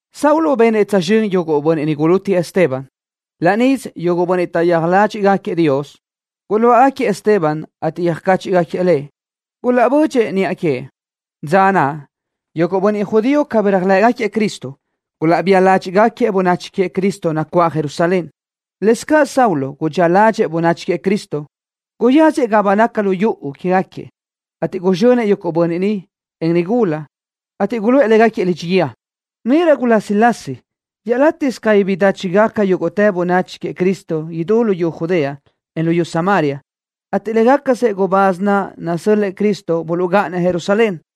Saulo benëʼ tsözxö́n yuguʼ bönniʼ niʼ gulútiëʼ Esteban. Laʼ níʼisö yuguʼ bönniʼ taʼyéaj ládxiʼgaquiëʼ Dios guluáʼagaquiëʼ Esteban, ateʼ yöjcáchiʼgaquiëʼ lëʼ. Gulaʼbö́dxidëʼë niʼa queëʼ. Dza naʼ yuguʼ bönniʼ judío cabí taʼyéajlëʼë Cristo gulaʼbía ládxiʼdaʼgaquiëʼ bönachi queëʼ Cristo nacuáʼ Jerusalén. Lëscaʼ Saulo gudxía ládxëʼë bönachi queëʼ Cristo. Guyáziëʼ gapa naca lu yuʼu quégaquiëʼ, ateʼ guzxönëʼ yuguʼ bönniʼ, en nigula, ateʼ guluʼë légaquiëʼ lidxi guíë. Níʼirö gulásilasi iaʼlátiʼsö cabí bidáchigaca yúguʼtë bönachi queëʼ Cristo idú luyú Judea, en luyú Samaria, ateʼ légacasëʼ gubáz naʼ nasö́l-lëʼë Cristo buluʼgáʼanëʼ Jerusalén.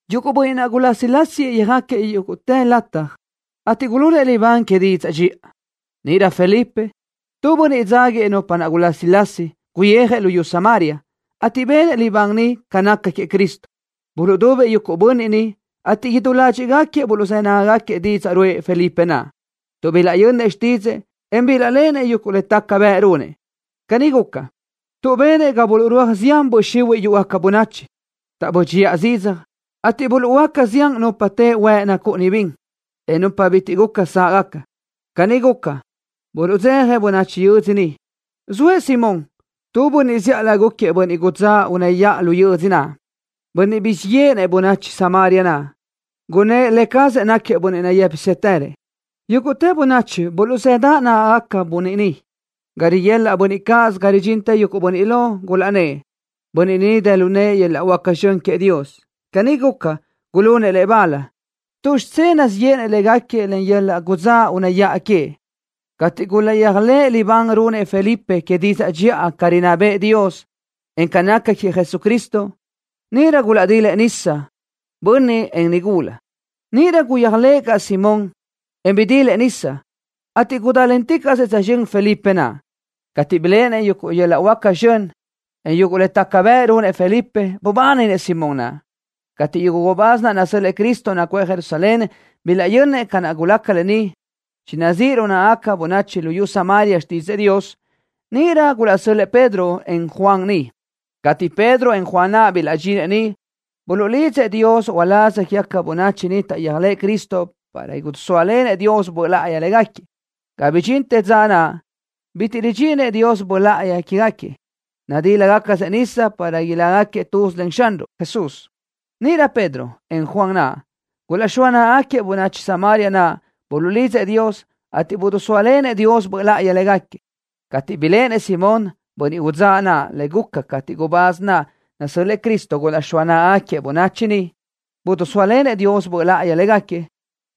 Yuguʼ bönniʼ naʼ gulásilasiëʼ yöjáquiëʼ yúguʼtë lataj, ateʼ gulunëʼ libán que didzaʼ dxiʼa. Níʼirö Felipe, tu bönniʼ dzáguiëʼ nupa naʼ gulásilasi, guyijëʼ luyú Samaria, ateʼ benëʼ libán niʼ ca naca queëʼ Cristo. Buluʼdubëʼ yuguʼ bönniʼ niʼ, ateʼ idú ládxiʼgaquiëʼ buluʼzë́ nágagaquiëʼ didzaʼ ruʼë Felipe naʼ, tuʼ bilaʼyönnëʼ xtídzëʼë, en bilaʼléʼenëʼ yuguʼ le taca bëʼ runëʼ. Caní guca, tuʼ benëʼ ga buluʼrúaj zián böʼ xihuiʼ yúʼugaca bönachi, taʼbö́dxiʼa zidzaj, ateʼ buluʼhuöáca zián nupa teʼe huëʼ nacúʼuni bin, en nupa bitiʼ guca sáʼgaca. Caní guca, buluʼdzeja bönachi yödzö niʼ. Zoëʼ Simón, tu bönniʼ zíʼalö gúquiëʼ bönniʼ udzáʼ unë́ yaʼa lu yödzö naʼ, bönniʼ guzxíʼ yéʼenëʼ bönachi Samaria naʼ, gunnë́ʼ lë cazëʼ náquiëʼ bönniʼ nayë́pisëtërëʼ. Yúguʼtë bönachi buluʼzëdaʼ nágagaca bönniʼ ni, ga riguelaʼ yuguʼ bönniʼ cáʼasö ga ridxintë yuguʼ bönniʼ lo, gulaʼnnë́ʼ: “Bönniʼ ni dë lu nëʼë yöl-laʼ huáca zxön queëʼ Dios.” Caní guca, gulunëʼ lëʼ bal, tuʼ xidzé nazíʼ yéʼenëʼ légaquiëʼ len yöl-laʼ gudzáʼ unë́ yaʼa queëʼ. Cateʼ gulaʼyéajlëʼë libán runëʼ Felipe que didzaʼ dxiʼa ca rinná bëʼë Dios, en ca naca queëʼ Jesucristo, níʼirö gulaʼdilëʼ nisa, bönniʼ, en nigula. Níʼirö guyéajlëʼë caʼ Simón naʼ, en bidilëʼ nisa, ateʼ gudálenticaʼsëʼ tsözxö́n Felipe naʼ. Cateʼ biléʼenëʼ yuguʼ yöl-laʼ huáca zxön, en yuguʼ le taca bëʼ runëʼ Felipe, bubáninëʼ Simón naʼ. Cateʼ yuguʼ gubáz naʼ nasö́l-lëʼë Cristo nacuʼë Jerusalén bilaʼyönnëʼ ca guca lë ni, chinazíʼ lu náʼagaca bönachi luyú Samaria xtídzëʼë Dios, níʼirö gulaʼsö́l-lëʼë Pedro, en Juan niʼ. Cateʼ Pedro, en Juan naʼ bilaʼdxinëʼ niʼ, buluʼlidzëʼ Dios uláz quégaca bönachi niʼ taʼyéajlëʼ Cristo para idisóalenëʼ Dios Böʼ Láʼayi léguequi. Ga bidxintë dza naʼ, bitiʼ ridxíninëʼ Dios Böʼ Láʼayi quégaquiëʼ. Nadílagacasëʼ nisa para ilácagaquiëʼ tuz len Xanruʼ Jesús. Níʼirö Pedro, en Juan naʼ, gulaʼxóa náʼagaquiëʼ bönachi Samaria naʼ. Buluʼlidzëʼ Dios, ateʼ bidisóalenëʼ Dios Böʼ Láʼayi légaquiëʼ. Cateʼ biléʼenëʼ Simón, bönniʼ udzáʼ naʼ, le guca cateʼ gubáz naʼ nasö́l-lëʼë Cristo gulaʼxóa náʼagaquiëʼ bönachi niʼ, bidisóalenëʼ Dios Böʼ Láʼayi légaquiëʼ,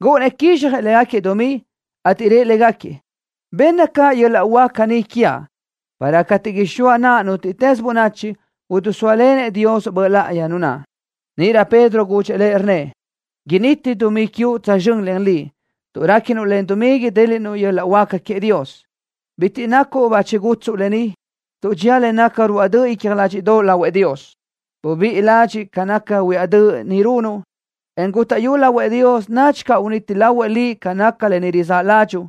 gúʼunnëʼ quizxjëʼ légaquiëʼ dumí, ateʼ rëʼ légaquiëʼ: —Benna caʼ yöl-laʼ huáca ni quiaʼ, para cateʼ ixóa naʼa nútiʼtës bönachi, idisóalenëʼ Dios Böʼ Láʼayi nu naʼ. Níʼirö Pedro gudxëʼ lëʼ, rnnëʼ: —Initi dumí quiuʼ tsözxö́n len liʼ, tuʼ réquinuʼ len dumí idéliʼnuʼ yöl-laʼ huáca queëʼ Dios. Bitiʼ nacuʼ bachi gútsuʼu lë ni, tuʼ dxía le naca ruáʼ döʼ icja ládxiʼdoʼo lahuëʼ Dios. Bubíʼi ládxiʼ ca naca huiáʼ döʼ ni runuʼ, en gútaʼyu lahuëʼ Dios, nadxi caʼ uniti lahuëʼ liʼ ca naca lë ni rizáʼ ládxuʼu.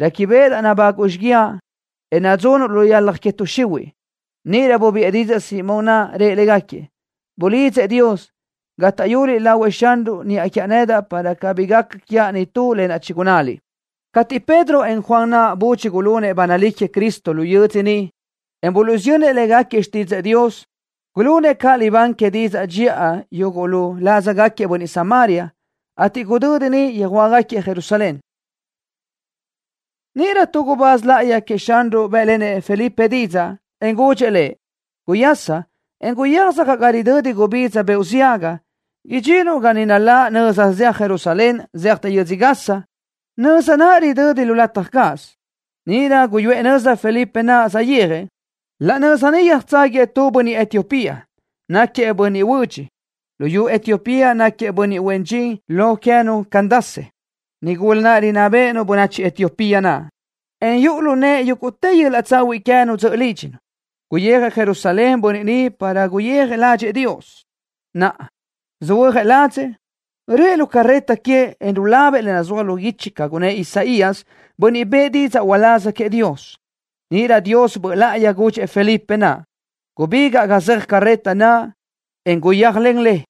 Réquibeʼedaʼ nabáguʼu xíguiaʼ, en nadzunuʼ lu yalaj que tuʼ xihuiʼ. Níʼirö bubiʼë didzaʼ Simón naʼ, rëʼ légaquiëʼ: —Buliʼlídzëʼ Dios, gátaʼyuliʼ lahuëʼ Xanruʼ niʼa quiaʼ nedaʼ para cabí gaca quiaʼ nitú lë naʼ chigunnáliʼ. Cateʼ Pedro, en Juan naʼ budxi gulunëʼ ba nalí queëʼ Cristo lu yödzö niʼ, en buluʼsiyönnëʼ légaquiëʼ xtídzëʼë Dios, gulunëʼ caʼ libán que didzaʼ dxiʼa yuguʼ lu ládzagaquiëʼ bönniʼ Samaria, ateʼ gudödi niʼ yöjhuö́jgaquiëʼ Jerusalén. Níʼirö tu gubáz láʼayi queëʼ Xanruʼ bë́ʼlenëʼ Felipe didzaʼ, en gudxëʼ lëʼ: —Guyasa, en guyéaj sacaʼ ga ridödi gubidza beoʼ ziaga. Idxinuʼ ga niʼ naláʼ nöza zeaj Jerusalén zéajtë yödzö Gaza, nöza naʼ ridödi lu lataj cáʼasö. Níʼirö guyuʼë nöza Felipe naʼ, saʼyéajëʼ. Laʼ nöza niʼ yöjtságuiëʼ tu bönniʼ Etiopía, náquiëʼ bönniʼ huödx. Luyú Etiopía náquiëʼ bönniʼ huen dxin lo queë́nu Candace, nigula naʼ rinná béʼenu bönachi Etiopía naʼ, en yuʼu lu nëʼë yúguʼtë yöl-laʼ tsahuiʼ queë́nu dzöʼö lídxinu. Guyijëʼ Jerusalén bönniʼ ni para guyéaj ládxëʼë Dios. Naʼa, söhuö́jëʼ ladzëʼ, röʼë lu carreta queëʼ, en rulabëʼ le nazúaj lu guichi ca gunnë́ʼ Isaías, bönniʼ bëʼë didzaʼ uláz queëʼ Dios. Níʼirö Dios Böʼ Láʼayi gudxëʼ Felipe naʼ: —Gubígaʼ ga zeaj carreta naʼ, en guyéajlen le.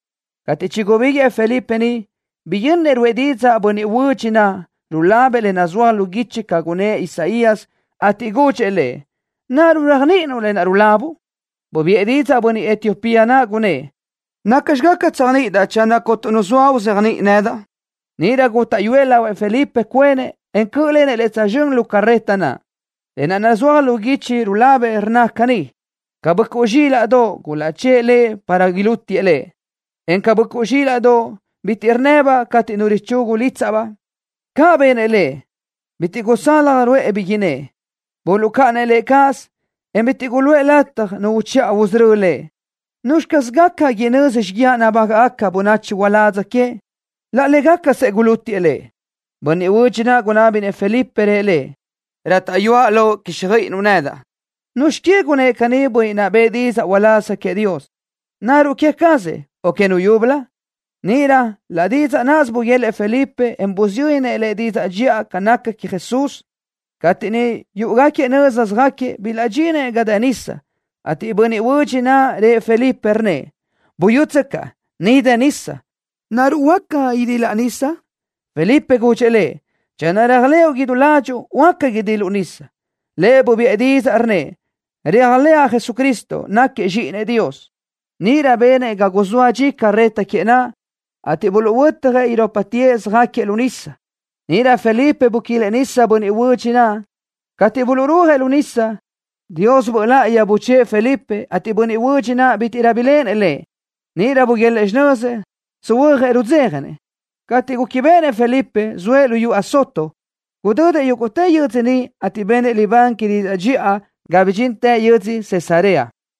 Cateʼ chigubíguëʼë Felipe niʼ, biyönnëʼ ruʼë didzaʼ bönniʼ huödx naʼ, rulabëʼ le nazúaj lu guichi ca gunnë́ʼ Isaías, ateʼ gudxëʼ lëʼ: —¿Naruʼ réajniʼinuʼ lë naʼ rulabuʼ? Bubiʼë didzaʼ bönniʼ Etiopía naʼ, gunnë́ʼ: —¿Nacxi gaca tséajniʼidaʼ channö cuntu nu zoa uzéajniʼi nedaʼ? Níʼirö gútaʼyuëʼ lahuëʼ Felipe cuenëʼ, en cö́ʼlenëʼ lëʼ tsözxö́n lu carreta naʼ. Lë naʼ nazúaj lu guichi rulabëʼ, rnna caní: Ca böʼcuʼ zxílaʼdoʼ, gulaʼchë́ʼë Lëʼ para ilútiëʼ Lëʼ, en ca böʼcuʼ zxílaʼdoʼ, bitiʼ rnnëbaʼ cateʼ nu richugu lítsaʼbaʼ, caʼ benëʼ Lëʼ, bitiʼ gusalaj ruʼë bi innë́ʼ. Buluʼcáʼanëʼ Lëʼ cáʼasö, en bitiʼ guluʼë lataj nu uchiʼa usörö́ Lëʼ. ¿Nuzxi caz gaca inözi xíguiaʼ nabágaʼgaca bönachi uládz queëʼ? Laʼ légacasëʼ gulútiëʼ Lëʼ. Bönniʼ huödx naʼ gunábinëʼ Felipe, rëʼ lëʼ: —Rátaʼyuaʼ loʼ quíxjöiʼinuʼ nedaʼ. ¿Nuzxi que gunnë́ʼ caní bönniʼ naʼ bëʼë didzaʼ uláz queëʼ Dios? ¿Naruʼ queë cazëʼ, o que nu yúbölö? Níʼirö laʼ didzaʼ nisö buguélëʼë Felipe, en busiyönnëʼ lëʼ didzaʼ dxiʼa ca naca queëʼ Jesús. Cateʼ niʼ yúʼugaquiëʼ nöza söjáquiëʼ, bilaʼdxinëʼ ga dë nisa, ateʼ bönniʼ huödx naʼ rëʼ Felipe, rnnëʼ: —Buyútsöcaʼ. Ni dë nisa. ¿Naruʼ huácatsö idilaʼ nisa? Felipe gudxëʼ lëʼ: —Channö réajlëʼu idú ládxuʼu, huáca idiluʼ nisa. Lëʼ bubiʼë didzaʼ, rnnëʼ: —Réajlëʼa Jesucristo, náquiëʼ Zxíʼinëʼ Dios. Níʼirö benëʼ ga guzóa dxisö carreta queëʼ naʼ, ateʼ buluʼhuötjëʼ irópatëʼ, yöjtsázagaquiëʼ lu nisa. Níʼirö Felipe buquilëʼ bönniʼ huödx naʼ nisa. Cateʼ buluʼrúajëʼ lu nisa, Dios Böʼ Láʼayi buchë́ʼë Felipe, ateʼ bönniʼ huödx naʼ bítiʼrö biléʼenëʼ lëʼ. Níʼirö buguélëʼë xinözëʼ, söhuö́jëʼ rudzéjanëʼ. Cateʼ chiréquibeʼenëʼ Felipe, zoëʼ lu yödzö Azoto. Gudödëʼ yúguʼtë yödzö niʼ, ateʼ benëʼ libán que didzaʼ dxiʼa, ga bidxintëʼ yödzö Cesarea.